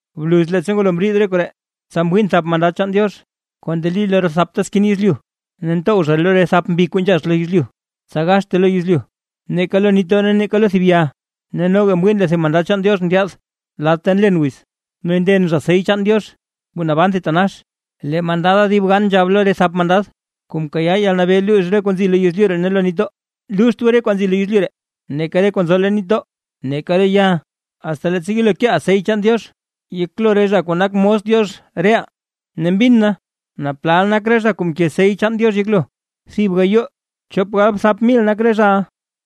Bluz leettsa ngwalo mriid re koree, tsa mwiin thap mandad chaan Diox kuu ndeli lo re thapta skin yezlyu, ne ntow zha lo re thap mbi kuu nzhax lo yezlyu, tsa gaxte lo yezlyu, neeka lo nitdoo ne lo neeka thib ya. Ne noga mwiin lee tedib mandad chaan Diox ndyaad lad ta nlen wiz; ne nden zha sey chaan Diox kuu naban thitanax. Lee mandada dib gan nzhab lo re thap mandad, kuu mkayaa yalnabee luux re kwaa nzi lo yezlyu ne lo nitdoo: ―¡Luuxt goo re kuu nzi lo yezlyu, neeka re kuu nzo leen nitdoo, neeka re ya, asta leettsa yelo keeʼaa sey chaan Diox yeklo re zha kuu nak mos Diox reʼaa! Ne mbin na naa plal nak re zha kuu mke sey chaan Diox yeklo: thib gayoo chop galbthap mil nak re zhaʼa,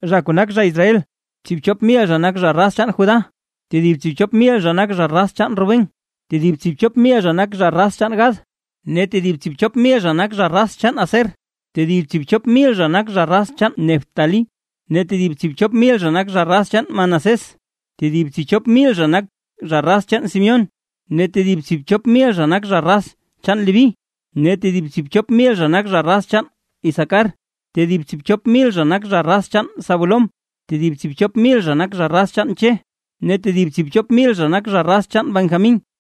zha kuu nak zha Israel. Tsiibchop mil zha nak zha raz chaan Judá, tedib tsiibchop mil zha nak zha raz chaan Rubén, tedib tsiibchop mil zha nak zha raz chaan Gad, tedib tsiibchop mil zha nak zha raz chaan Aser, tedib tsiibchop mil zha nak zha raz chaan Neftalí, tedib tsiibchop mil zha nak zha raz chaan Manasés, tedib tsiibchop mil zha nak zha raz chaan Simeón, tedib tsiibchop mil zha nak zha raz chaan Leví, tedib tsiibchop mil zha nak zha raz chaan Isacar, tedib tsiibchop mil zha nak zha raz chaan Zabulón, tedib tsiibchop mil zha nak zha raz chaan Che ne lee tedib tsiibchop mil zha nak zha raz chaan Benjamín.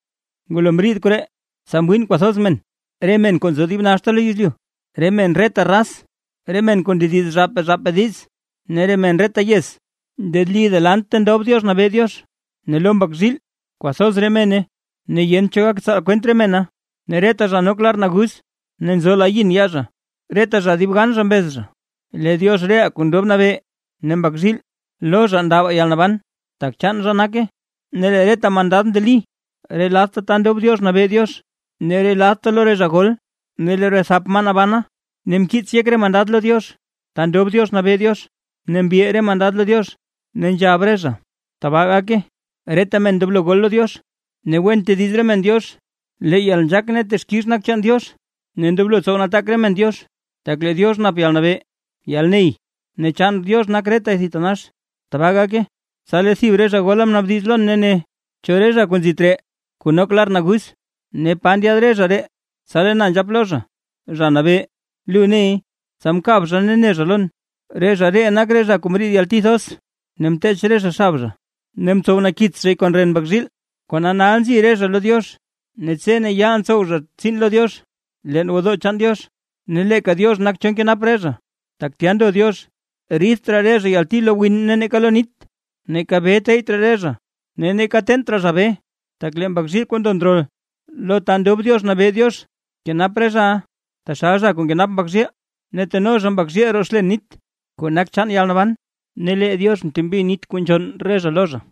Ngulo mriid koree, tsa mwiin kwathoz men, re men kuu nzo dib naxta lo yezlyu, re men reta raz, re men kuu ndediz zhaapaa zhaapaa diiz, ne re men reta yez ndeli delant lo ta ndob Diox nabee Diox ne lo Mbak zhiil; kwathoz re mena ne yent cho gak tsaal kwent re mena, ne reta zha nok lar naguz ne nzo la yin yaa zha. Reta zha dib gan zha mbez zha: ¡Lee Diox reʼaa kuu ndob nabee ne Mbak zhiil, lo zha ndabaa yalnaban, tak chaan zha nake! Ne lee reta mandad ndeli re ladta ta ndob Diox nabee Diox ne re ladta lo re zha gol, ne lo re thap maa nabana; ne mkiits yek re mandad lo Diox, ta ndob Diox nabee Diox, ne mbil re mandad lo Diox; ne nzhab zha: ¡Tbaa gake! Reta men ndoblo gol lo Diox, ne wen tediz re men Diox, lee yalnzhaak ne texkix nak chaan Diox, ne ndoblo tsow nataak re men Diox, tak lee Diox nap yalnabee yalney ne chaan Diox nak retay thitanax. ¡Tbaa gake! Tsa lee thib re zha gola mnaabdiz lon ne ne: ―¿Cho re zha kuu nzi tree kuu nok lar naguz? Ne ¿pa ndyaad re zha ree? Tsa lee na nzhap lo zha: ―Zha Nabee, lu ney. Tsa mkab zha, ne ne zha lon: ―Re zha ree nak re zha kuu mriid yalti thoz, ne mteech re zha xab zha ne mtsow nakits zhay kon ren Mbak zhiil. Kona nal nzi re zha lo Diox, ne tse ne yaal ntsow zha tsiin lo Diox leen gwodoo chaan Diox; ne leeka Diox nak cho nkenap re zha, tak tya ndo Diox. Ridt raa re zha yalti lo win ne neeka lo nit, neeka bee teyyt raa zha, ne neeka teent raa zha bee; tak lee Mbak zhiil kuu ndo ndrol lo ta ndob Diox nabee Diox, kenap re zhaʼa, taxal zha kuu nkenap mbak zhiil, ne teno Mbak zhiil zha roo xlen nit kuu nak chaan yalnaban, ne lee Diox mtembi nit kuu nzhonn re zha lo zha.